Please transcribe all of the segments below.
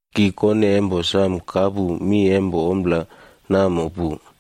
Ki kone empo samo kapu mi empo ommo namo pu,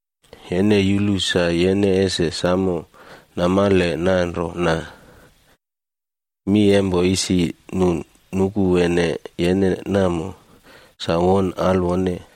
Yene yulu sa yene ese samo namale nanrona, mi empo isi nu nukuwene yene namo, sa won alwone.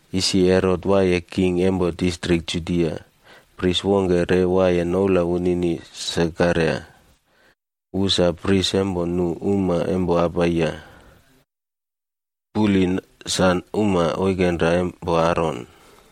Isi Herot waiye king empo distrik Judia, pris wongke re waiye noula wunini Sekaraia. Wu sa pris empo grup wongke nu fai nouwne Abiya. Puli wunini sa uma oikenra empo Aron,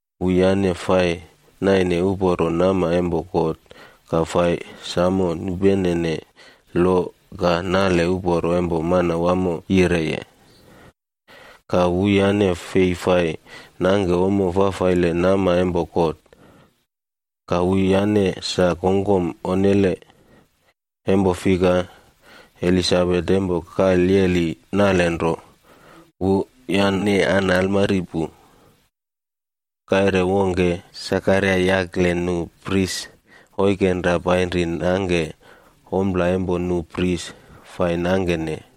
Wuyane fai naine uporo nama empo God, ka fai samo nupenene lo ka nale uporo empo Manawamo yireye, ka wuyane fei fai nangke ommo fafaile nama empo God. Ka wuyane sa kongkom onnele, empo fika, Elisabet empo kalyeli nalenro, wuyane an almari pu. Kaire wongke, Sekaraia yakle nu pris oikenra painri nangke ompla empo nu pris fai nangkene,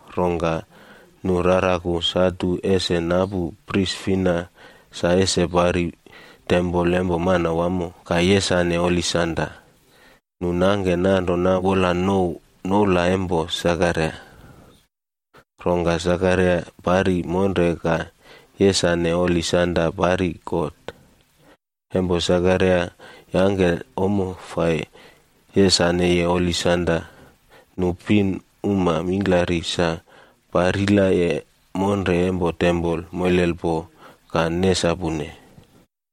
Rongka nu raraku satu ese napu pris fina sa ese pari tempol empo Manawamo, ka yesane holi sanda. Nu nangke nanrona wola nu nouw noula empo Sekaraia. Rongka Sekaraia pari monre ka yesane holi sanda pari God. Empo Sekaraia yangke ommo fai yesaneye holi sanda, nu pinuma mingklari sa parilaye monre empo tempol moilelpo ka nesapune.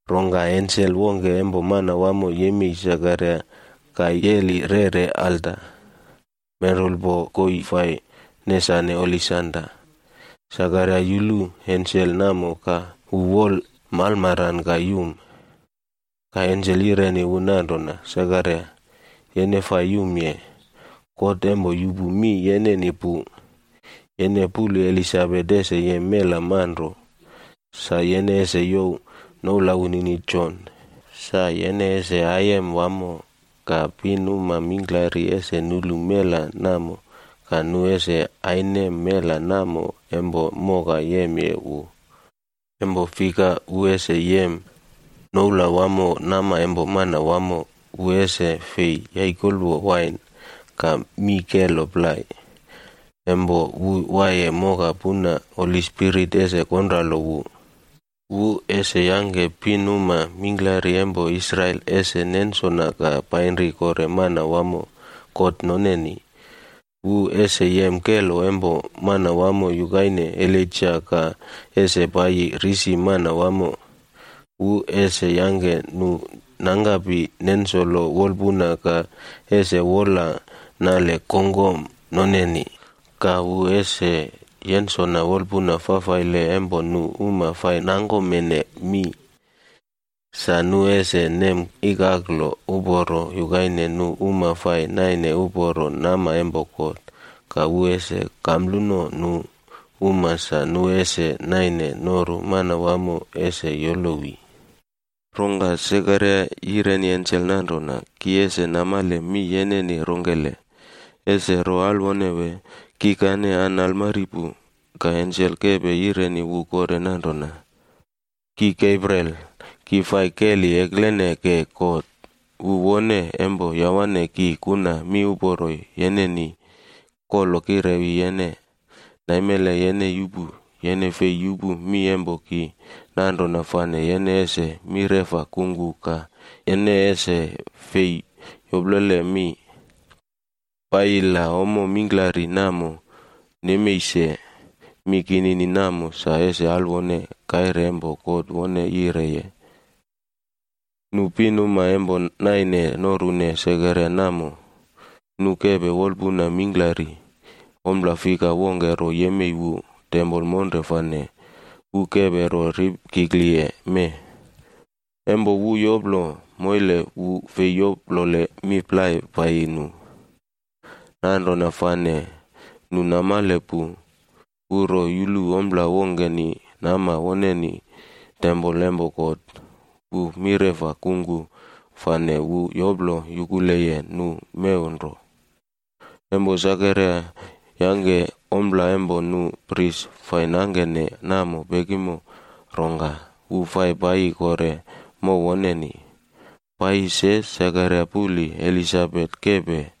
Rongka ensel wongke empo Manawamo yemei Sekaraia ka yeli rere alta menrulpo koii fai nesanene holi sanda. Sekaraia yulu ensel namo ka wu wol malmaran ka yum. Ka ensel yireni wu nanrona, “Sekaraia, yene fai yumye. God empo yupu mi yeneni pu. Yene puli Elisabet ese yem mela manro. Sa yene ese youw noula wunini Jon. Sa yene ese aiyem wamo. Ka pinuma mingklari ese nulu mela namo, ka nu ese ainem mela namo empo moka yemye wu. Empo fika, wu ese yem noula wamo nama empo Manawamo. Wu ese fei yaikolwo wain, ka mii kelo plai. Empo wu waiye moka puna, Holi Spirit ese konralo wu. Wu ese yangke pinuma mingklari empo Israel ese nensona ka painri kore Manawamo, God noneni. Wu ese yem kelo empo Manawamo yukaine Elaija ka ese paiyi risi Manawamo. Wu ese yangke nu nangkapi nensolo wolpuna ka ese wola nale kongkom noneni. Ka wu ese yensolo wolpuna fafaile empo nu uma fai nangkomene mi, sa nu ese nem ikaklo uporo yukaine nu uma fai naine uporo nama empo God. Ka wu ese kampluno nu uma sa nu ese naine noru Manawamo ese yolowi.” Rongka Sekaraia yireni ensel nanrona, “Ki ese namale mi yeneni rongkele, ese ro alwone wee? Kikane an almari pu.” Ka ensel kepe yireni wu kore nanrona, “Ki Gabriel, ki fai keli eklene ke God. Wu wone empo yawane ki kuna miuporo yeneni kolo kirewi yene. Naimele yene yupu. Yene fei bilipim mi empo ki, nanrona fane yene ese mireꞌfa kungku ka yene ese fei yoplole mi, paiyi la ommo mingklari namo nemei se. Mi kinini namo sa ese alwone kaire empo God wone yina.” Nu pinuma empo naine norune Sekaraia namo, nu kepe wolpuna mingklari ompla fika wongke ro yemei wu tempol monre fane wu kepe ro ripkikliye mee. Empo wu yolo moile wu fei yoplole mi plai paiyi nu. Nanrona fane nu namale pu, wu ro yulu ompla wongkeni nama woneni tempol empo God. Wu mireꞌfa kungku fane wu yoplo yukuleye nu mew nro. Empo Sekaraia yangke ompla empo nu pris fai nangkene namo pekimo, rongka wu fai paiyi kore mow woneni. Paiyi se, Sekaraia puli Elisabet kepe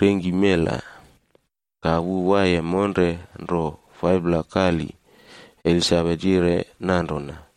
rengki mela. Ka wu waiye monre nro 5pla kali. Elisabet yire nanrona,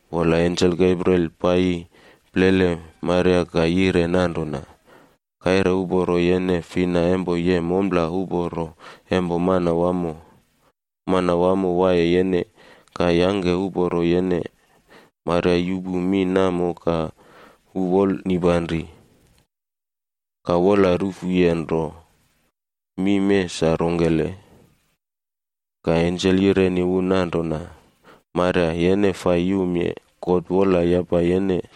Wola ensel Gabriel paiyi plele Maria ka yire nanrona, “Kaire uporo yene fina empo yem ompla uporo empo Manawamo. Manawamo waiye yene, ka yangke uporo yene.” Maria yupu mi namo ka wu wola mingklari, ka wola rufuye nro, “Mi mee sa rongkele?” Ka ensel yireni wu nanrona, “Maria yene fai yumye. God wola yapaye yene.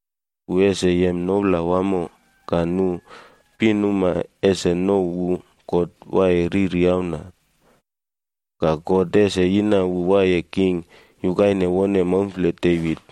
Wu ese yem noula wamo. Ka nu pinuma ese nouw wu Auna empo God Waiye Riri. Ka God ese yina wu waiye king yukaine wone maumfle Devit.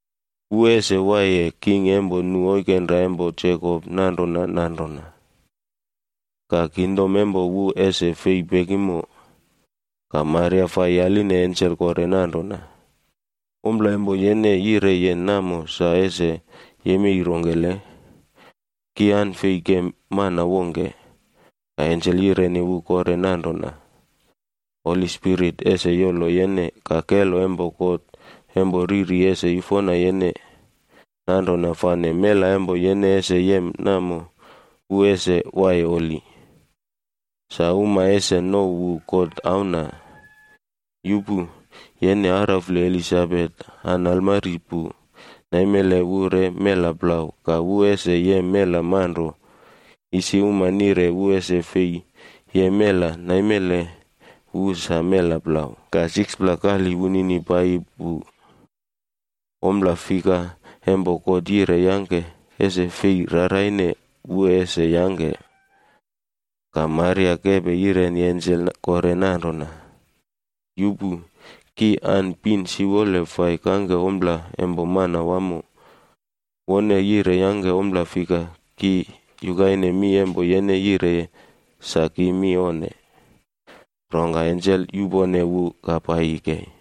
Wu ese waiye king empo nu oikenra empo Jekop nanrona nanrona. Ka kingdom empo wu ese fei pekimo.” Ka Maria fai yaline ensel kore nanrona, “Ompla empo yene yireye namo sa ese yemei rongkele? Ki an fei kem mana wongke.” Ka ensel yireni wu kore nanrona, “Holi Spirit ese yolo yene, ka kelo empo God empo Riri ese yufona yene. Nanrona fane mela empo yene ese yem namo, wu ese waiye holi. Sa uma ese nouw wu God Auna. Yupu. Yene araufle Elisabet an almari pu, naimele wu re mela plau ka wu ese yem mela manro. Isi uma nire wu ese fei yem mela. Naimele wu sa mela plau, ka 6pla kali wunini paiyi pu. Ompla fika empo God yire yangke, ese fei raraine wu ese yangke.” Ka Maria kepe yireni ensel kore nanrona, “Yupu! Ki an pin siwole fai kangke ommo empo Manawamo. Wone yire yangke ommo fika ki yukaine mi empo yene yireye, sa ki mi onne.” Rongka ensel yupone wu ka paiyi kei.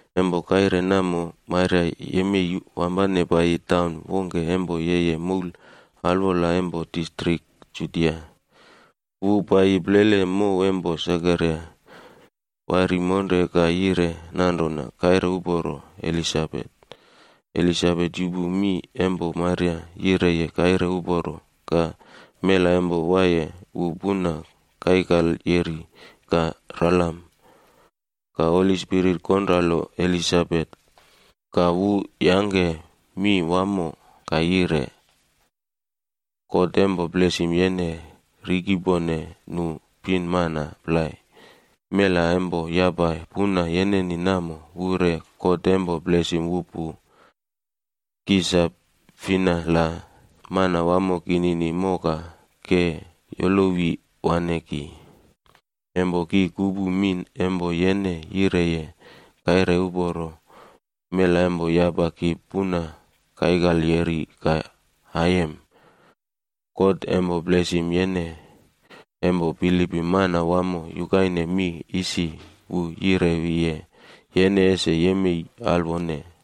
Empo kaire namo, Maria yemei ka wampane paiyi taun wongke empo yeye moul alwola empo distrik Judia. Wu paiyi plele mow empo Sekaraia ka pari monre ka yire nanrona kaire uporo Elisabet. Elisabet yupu mi empo Maria yireye kaire uporo, ka mela empo waiye wu puna kaikalyeri ka ralam. Ka Holi Spirit konralo Elisabet, ka wu yangke mi wamo ka yire, “God empo blesim yene rikepone nu pinmana plai. Mela empo yapa puna yeneni namo wu re God empo blesim wu pu. Ki sa fina la Manawamo kinini moka ke yolowi waꞌne ki? Empo ki kupu mi empo yene yireye kaire uporo, mela empo yapa ki puna kaikalyeri ka aiyem. God empo blesim yene empo bilipim Manawamo yukaine mi isi wu yirewiye yene ese yemei alwone.”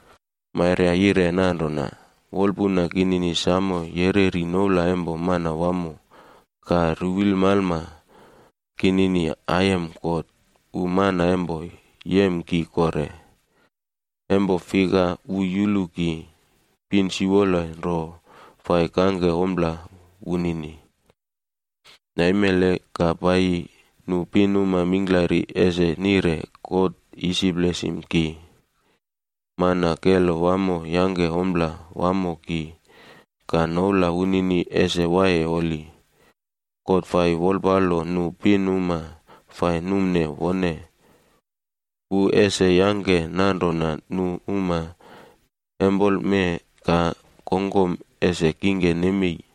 Maria yire nanrona: “Wolpuna kinini samo yereri noula empo Manawamo. Ka ruwilmalma kinini aiyem God, wu Mana empo Yem Ki Kore. Empo fika wu yulu ki pin siwole nro fai kangke ompla wunini, wu yulu ki ka wolpalo ki. Naimele ka paiyi nu pinuma mingklari ese nire God isi blesim ki. Empo fika Mana yuna Kelo Wamo fai yangke ompla wamo ki, ka noula wunini ese waiye holi. God fai wolpalo nu pinuma fai numne wone. Wu ese yangke nanrona nu uma empoleme ka kongkom ese kingke nemei.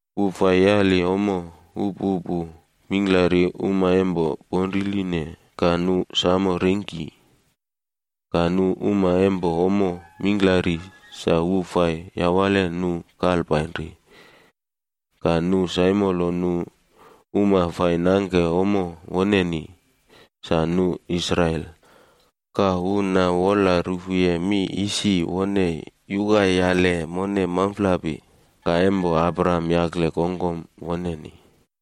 Wu fai yali ommo upupu mingklari uma empo ponriline, ka nu samo rengki. Ka nu uma empo ommo mingklari sa wu fai yawale nu kalpainri. Ka wu saimolo nu uma fai nangke ommo woneni, sa nu Israel. Ka wu na wola rufuye mi isi wone yukayali mone maumflapi, ka empo Abraham yakle kongkom woneni,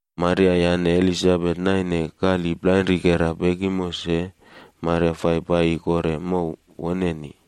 Maria yane Elisabet naine kali plainrikera pekimo se, Maria fai paiyi kore mokoi woneni.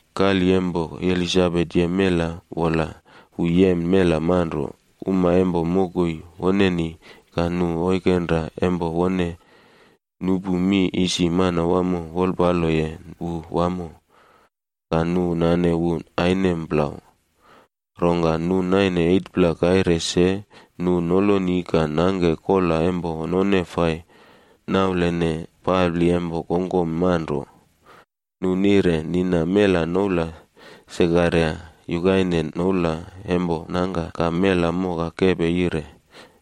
Kali empo Elisabet yem mela, wola wu yem mela manro. Pinuma empo mokoi woneni ka nu oikenra empo wone nupu mi isi Manawamo wolpaloye wu wamo, ka nu nane wu ainem plau. Rongka nu naine 8pla kaire se, nu noloni ka nangke kola empo none fai naulene papli empo kongkom manro. Nu nire nina mela noula yukaine noula empo nangka Sekaraia. Ka mela moka kepe yire,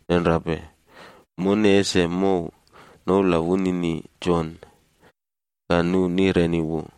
“Nenrape! Mone ese mouw noula wunini Jon.” Ka nu nireni wu,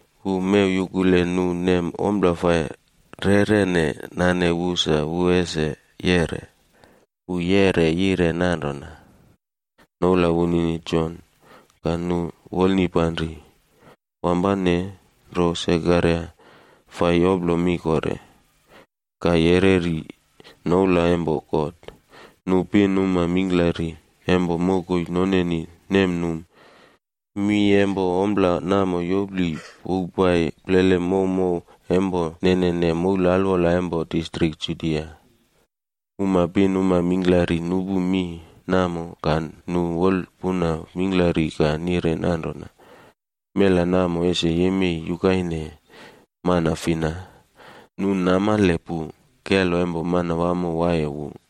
Wu mew yukule nu nem ompla fai reꞌrene nane wu sa wu ese yeꞌre. Wu yeꞌre yire nanrona, “Noula wunini Jon.” Ka nu wolnipanri. Wampane nro Sekaraia fai yoplo mi kore, ka yereri noula empo God. Nu pinuma mingklari empo mokoi noneni nemnum. Mi empo ompla namo yopli powpai plele mokoi mokoi mingklari empo nenene moul alwola empo distrik Judia. Uma pinuma mingklari nupu mi namo, ka nu wolpuna mingklari ka nire nanrona, “Mela namo ese yemei yukaine mana fina?” Empo fikanu namale pu, kelo empo Manawamo waiye wu.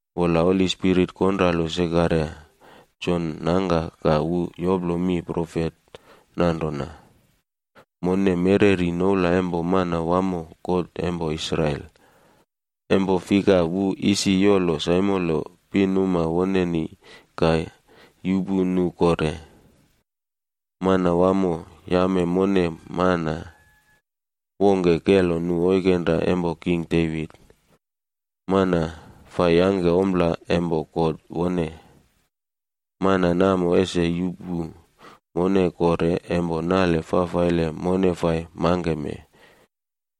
Wola Holi Spirit konralo Sekaraia, Jon nangka ka wu yoplo mi profet nanrona: “Mone mereri noula empo Manawamo God empo Israel. Empo fika wu isi yolo saimolo pinuma woneni ka yuꞌpu nu kore. Manawamo yame mone mana wongke kelo nu oikenra empo king Devit, mana fai yangke ompla empo Godni. Mana namo ese yuꞌpu mone kore empo nale fafaile mone fai mangkeme,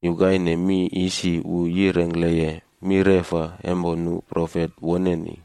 yukaine mi isi wu yirengkleye mireꞌfa empo nu holi profet woneni.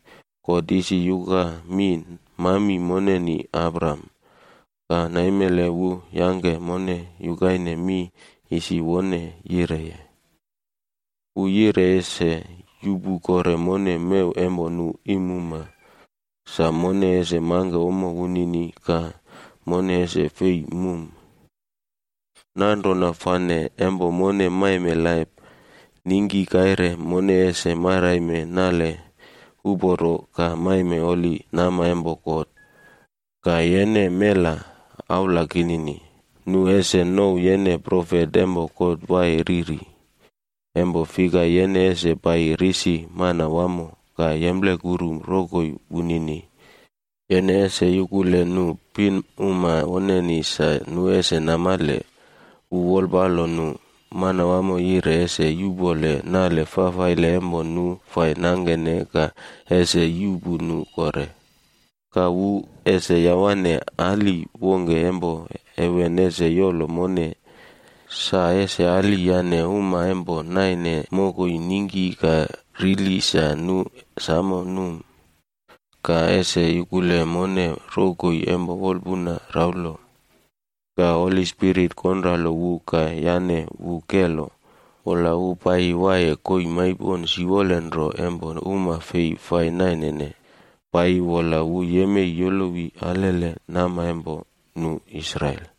God isi yuka mi mami moneni Abraham. Ka naimele wu yangke mone yukaine mi isi wone yireye. Wu yire ese yuꞌpu kore mone mew empo nu iimuma, sa mone ese mangke ommo wunini ka mone ese fei mum. Nanrona fane empo mone maime laip, ningki kaire mone ese maraime nale uporo ka maime holi nama empo God. Ka yene, mela aula kinini, nu ese nouw yene profet empo God Waiye Riri, empo fika yene ese paiyi risi Manawamo, ka yemplekuru rokoi wunini. Yene ese yukule nu pinuma woneni sa nu ese namale, wu wolpalo nu wamo, God yire ese yuꞌpole nale fafaile empo nu fai nangkene ka ese yuꞌpu nu kore. Ka wu ese yawane ali wongke empo heven yukaine kaire fai yeriye ningkinamnole ese yolo mone, sa ese ali yane uma empo naine mokoi ningki ka rili sa nu samo num, ka ese yukule mone rokoi empo wolpuna raulo.” Ka Holi Spirit konralo wu ka yane wu kelo. Wola wu paiyi waiye koii maipon siwole nro empo uma fei fai nainene, paiyi wola wu yemei yolowi alele nama empo nu Israel.